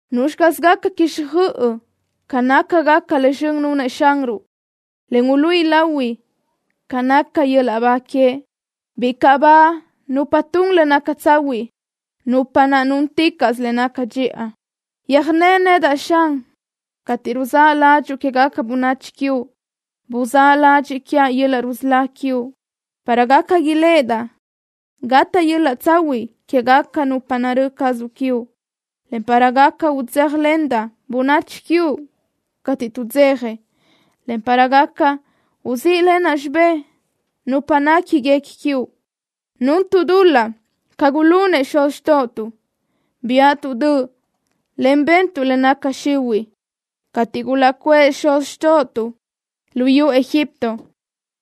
¿Nuzxi caz gaca quixjöʼ ca nácagaca le zxön nunëʼ Xanruʼ, en uluíʼi lahui ca naca yöl-laʼ ba queëʼ? ¡Bicaʼ ba nupa tun le naca tsahuiʼ, nupa naʼ túnticaʼsö le naca dxiʼa! Yöjné nedaʼ, Xan, cateʼ ruzáʼ ládxuʼu quégaca bönachi quiuʼ. Buzáʼ ladxiʼ quiaʼ yöl-laʼ rusölá quiuʼ, para gaca iléʼedaʼ gataʼ yöl-laʼ tsahuiʼ quégaca nupa narö́ cazuʼ quiuʼ, en para gaca udzéjalendaʼ bönachi quiuʼ cateʼ tuʼdzeja, en para gaca uzíʼlenaʼ xibé nupa néquiguequi quiuʼ. Nuntuʼ dul-laʼ ca gulunëʼ xuz xtóʼotuʼ. Biáʼatuʼ döʼ, en bentuʼ le naca xihuiʼ. Cateʼ gulaʼcuʼë xuz xtóʼotuʼ luyú Egipto,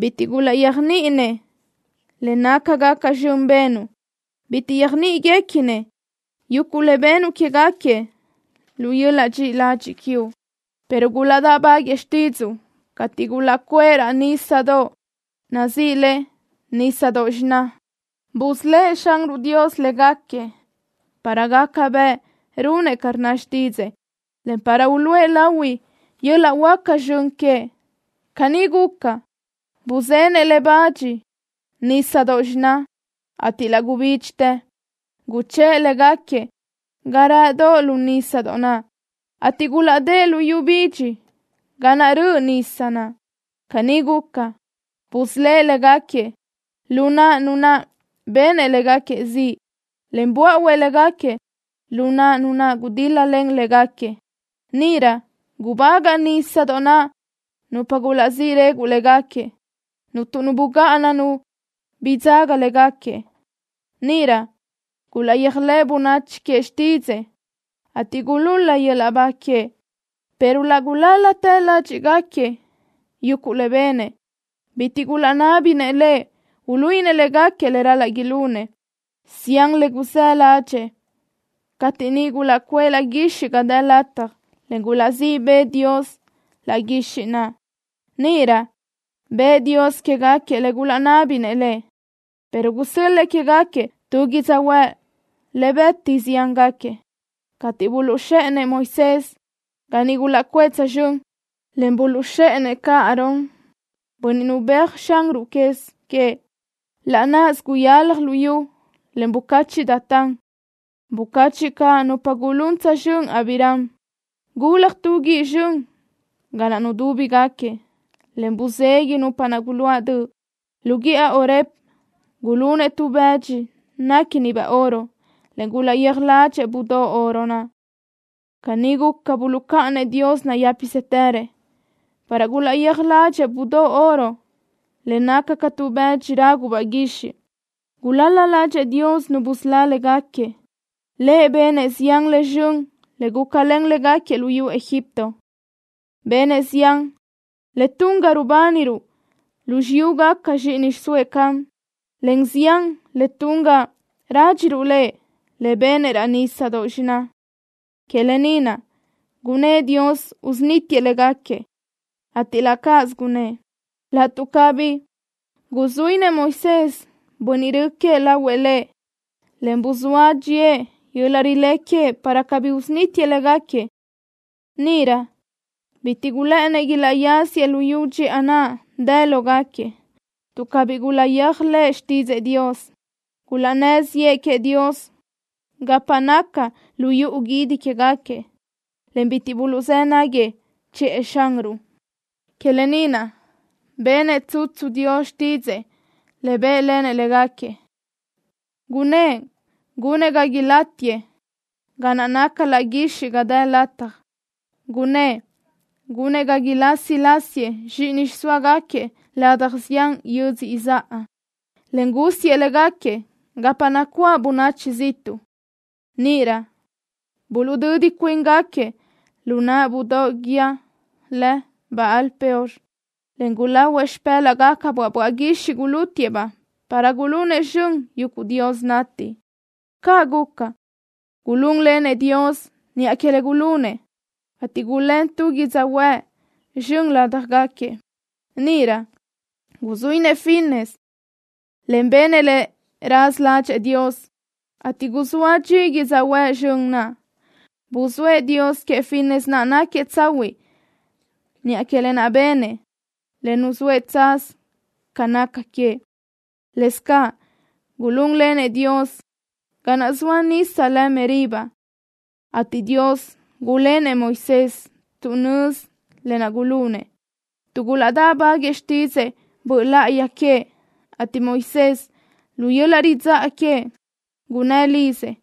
bitiʼ gulaʼyéajniʼinëʼ le nácagaca zxön benuʼ. Bitiʼ yöjnéguequinëʼ yuguʼ le benuʼ quégaquiëʼ lu yöl-laʼ dxiʼi ladxiʼ quiuʼ, pero gulaʼdáʼbaguëʼë xtídzuʼu cateʼ gulaʼcuʼë raʼ nísadoʼ lë Nísadoʼ Xiná. Busölë́ʼ Xanruʼ Dios légaquiëʼ para gaca bëʼ runëʼ ca rnna xtídzëʼë, en para uluʼe lahui yöl-laʼ huáca zxön queëʼ. Caní guca, buzenëʼ le bach Nísadoʼ Xiná naʼ, ateʼ laʼ gubídxitë. Guchë́ʼë légaquiëʼ ga rëʼdoʼ lu nísadoʼ naʼ, ateʼ gulaʼdë́ʼ lu yu bidxi ga naʼ gurö́ʼö nisa. Caní guca, busölë́ʼ légaquiëʼ lu naʼ nu naʼ benëʼ légaquiëʼ ziʼ, en buáʼuëʼ légaquiëʼ lu naʼ nu naʼ gudíl-lalen légaquiëʼ. Níʼirö gubagaʼ nísadoʼ naʼ nupa gulaʼsí reguʼ légaquiëʼ. Cuntu nu bugáʼana nu bidzaga léguequi. Níʼirö gulaʼyéajlëʼ bönachi queëʼ xtídzëʼë, ateʼ gulul-la yöl-laʼ ba queëʼ. Pero laʼ gulál-latë ládxiʼgaquiëʼ yuguʼ le benëʼ. Bitiʼ gulaʼnábinëʼ Lëʼ uluíʼinëʼ légaquiëʼ le ral-laʼ ilunëʼ. Zián le gulaʼzë́ ládxëʼë cateʼ niʼ gulaʼcuʼë laʼ guixiʼ ga dë lataj, en gulaʼzíʼ bëʼë Dios laʼ guixiʼ naʼ. Níʼirö bëʼë Dios quégaquiëʼ le gulaʼnábinëʼ Lëʼ, pero gusö́l-lëʼë quégaquiëʼ tu yödzöhuë́ʼ le bëti ziángaquiëʼ. Cateʼ buluʼzxéʼenëʼ Moisés ga niʼ gulaʼcuʼë tsözxö́n, en buluʼzxéʼenëʼ caʼ Aarón, bönniʼ nubéajëʼ Xanruʼ quez queëʼ, laʼ náʼasö guyalaj luyú, en bucachiʼ Datán. Bucachiʼ caʼ nupa gulún tsözxö́n Abiram. Gulaj tu guíʼ zxön ga naʼ nudúbigaquiëʼ, en buzeguiʼ nupa naʼ guluáʼ döʼ. Lu guíʼa Horeb gulunëʼ tu bë́dxidoʼ néquinibaʼ oro, en gulaʼyéaj ládxëʼë budóʼ oro naʼ. Caní guca buluʼcáʼanëʼ Dios nayë́pisëtërëʼ, para gulaʼyéaj ládxëʼë budóʼ oro le naca ca tu bëdxi rágubaʼ guixiʼ. Gulal-la ládxëʼë Dios Nu busölá légaquiëʼ. Lëʼ benëʼ zián le zxön le gulácalen légaquiëʼ luyú Egipto. Benëʼ zián le tun ga rubániruʼ lu xiyúgaca zxíʼini xiʼsóëʼ Ham, en zián le tun ga rádxiruʼ Lëʼ le benëʼ raʼ Nísadoʼ Xiná. Que lë ni naʼ gunnë́ʼ Dios usunítiëʼ légaquiëʼ, ateʼ laʼ cáʼasö gunëʼ laʼtuʼ cabí guzuínëʼ Moisés, bönniʼ rö queëʼ, lahuëʼ Lëʼ, en buzóa dxíëʼ yöl-laʼ rilé queëʼ para cabí usunítiëʼ légaquiëʼ. Níʼirö bitiʼ gulë́ʼënëʼ ilaʼyáziëʼ luyú dxiʼa naʼ dë lógaquiëʼ tuʼ cabí gulaʼyéajlëʼë xtídzëʼë Dios. Gulaʼnnë́ ziʼë queëʼ Dios gapa naca lu yuʼu guídi quégaquiëʼ, en bitiʼ buluʼzë́ náguiëʼ chiʼë Xanruʼ. Que lë ni naʼ benëʼ tsutsu Dios xtídzëʼë le bë́ʼlenëʼ légaquiëʼ, gunnë́ʼ gunëʼ ga ilátiëʼ ga naʼ naca laʼ guixiʼ ga dë lataj. Gunnë́ʼ gunëʼ ga ilasi lásiëʼ zxíʼini xiʼsóagaquiëʼ ladaj zián yödzö izáʼa, en gúsiëʼ légaquiëʼ gapa nacuáʼ bönachi ziʼtuʼ. Níʼirö buluʼdödi cuíngaquiëʼ lu naʼ budóʼ guíë lë Baal-peor, en gulahuëʼ xipë́laʼgacabaʼ böaʼ guixiʼ gulútiëʼ-baʼ para gulunëʼ zxön yuguʼ dios nati. Caʼ guca, gulún lenëʼ Dios niʼa que le gulunëʼ, ateʼ gulén tu yödzöhuë́ʼ zxön ládjagaquiëʼ. Níʼirö guzuínëʼ Finees, en benëʼ le raza ládxëʼë Dios, ateʼ guzóa dxi yödzöhuë́ʼ zxön naʼ. Buzóëʼ Dios queëʼ Finees naʼ náquiëʼ tsahuiʼ niʼa que lë naʼ benëʼ le nuzóëʼ tsaz ca naca queëʼ. Lëscaʼ gulún lenëʼ Dios ga naʼ zoa nisa lë Meriba, ateʼ Dios gulénëʼ Moisés tuʼ nözi lë naʼ gulunëʼ tuʼ gulaʼdáʼbaguëʼë xtidxëʼë Böʼ Láʼayi queëʼ, ateʼ Moisés, lu yöl-laʼ ridzáʼa queëʼ, gunnë́ lizëʼ.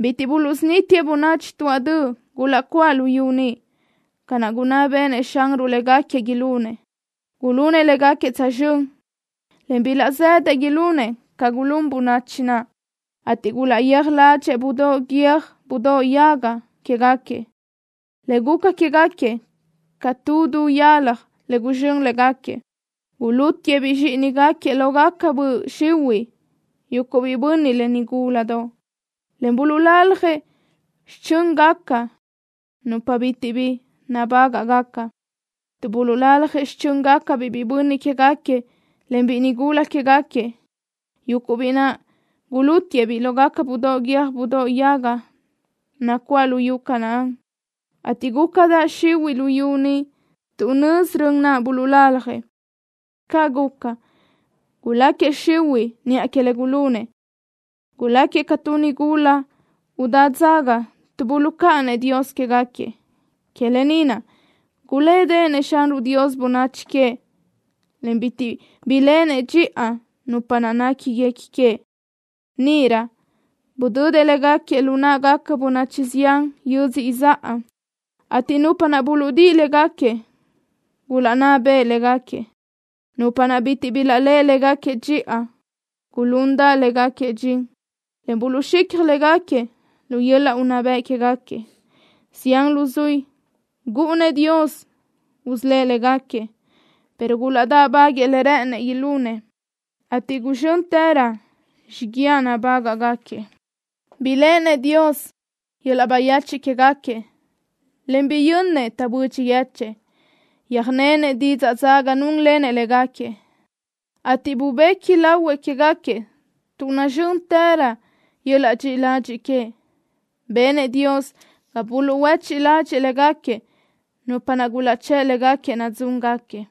Bitiʼ buluʼsunítiëʼ bönachi tuáʼ döʼ gulaʼcuáʼ lu yu ni, ca naʼ gunná béʼenëʼ Xanruʼ légaquiëʼ ilunëʼ. Gulunëʼ léguequi tsözxö́n en bilaʼzë́dëʼ ilunëʼ ca gulún bönachi naʼ, ateʼ gulaʼyéaj ládxëʼë budóʼ guiö́j budóʼ yaga quéguequi, le guca quégaquiëʼ ca tu du yalaj le guzxö́n légaquiëʼ. Gulútiëʼ-biʼ zxíʼinigaquiëʼ lógaca böʼ xihuiʼ, yuguʼ biʼi bönniʼ, en nigúladoʼ, en buluʼlaljëʼ xichö́ngaca nupa bitiʼ bi nabágaʼgaca tuʼ buluʼlaljëʼ xichö́ngacabiʼ biʼi bönniʼ quégaquiëʼ, en biʼi nigula quégaquiëʼ, yuguʼ biʼi naʼ gulútiëʼ-biʼ lógaca budóʼ guiö́j budóʼ yaga nacuáʼ luyú Canaán, ateʼ gúcadaʼ xihuiʼ luyú ni tuʼ nözi rön naʼ buluʼlaljëʼ. Caʼ guca, guláquiëʼ xihuiʼ niʼa que le gulunëʼ. Guláquiëʼ ca tu nigula udá dzaga tuʼ buluʼcáʼanëʼ Dios quégaquiëʼ. Que lë ni naʼ gulédeʼenëʼ Xanruʼ Dios bönachi queëʼ, en bitiʼ biléʼenëʼ dxiʼa nupa naʼ néquiguequi queëʼ. Níʼirö budödëʼ légaquiëʼ lu náʼagaca bönachi zián yödzö izáʼa, ateʼ nupa buluʼdíʼi légaquiëʼ gulaʼnná beʼe légaquiëʼ. Nupa naʼ bitiʼ bilaʼléʼe légaquiëʼ dxiʼa gulundaʼ légaquiëʼ dxin, en buluʼzxicaj légaquiëʼ lu yöl-laʼ unná bëʼ quéguequi. Zián luzuí gúʼunëʼ Dios usölë́ʼ légaquiëʼ, pero gulaʼdáʼbaguëʼë le rë́ʼënëʼ ilunëʼ, ateʼ guzxö́ntërö xiguiaʼ nabágaʼgaquiëʼ. Biléʼenëʼ Dios yöl-laʼ bayechiʼ quégaquiëʼ en biyönnëʼ taʼbödxi yechë́ʼë. Yöjnenëʼ didzaʼ dzaga núnlenëʼ légaquiëʼ, ateʼ bubequi lahuëʼ quégaquiëʼ tuʼ nazxö́ntërö yöl-laʼ dxiʼi ladxiʼ queëʼ. Benëʼ Dios ga buluʼhuéchiʼ ladxiʼ légaquiëʼ nupa naʼ gulaʼchë́ʼ légaquiëʼ nadzúngaquiëʼ.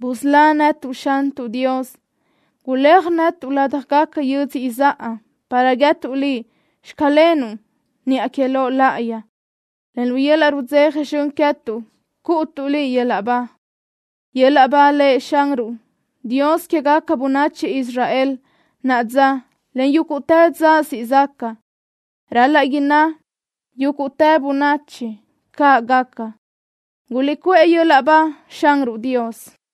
¡Busölá netuʼ, Xantuʼ Dios! Guléaj netuʼ ládjagaca yödzö izáʼa para guíëtuʼ Liʼ: “Xclenuʼ” niʼa que Loʼ láʼayi, en lu yöl-laʼ rudzeja zxön queë́tuʼ cúʼutuʼ Liʼ yöl-laʼ ba. ¡Yöl-laʼ ba Lëʼ Xanruʼ, Dios quégaca bönachi Israel naʼa dza, en yúguʼtë dza siʼ zaca! Ral-laʼ ilaʼnná yúguʼtë bönachi: “¡Caʼ gaca! ¡Guliʼcuʼë yöl-laʼ ba Xanruʼ Dios!”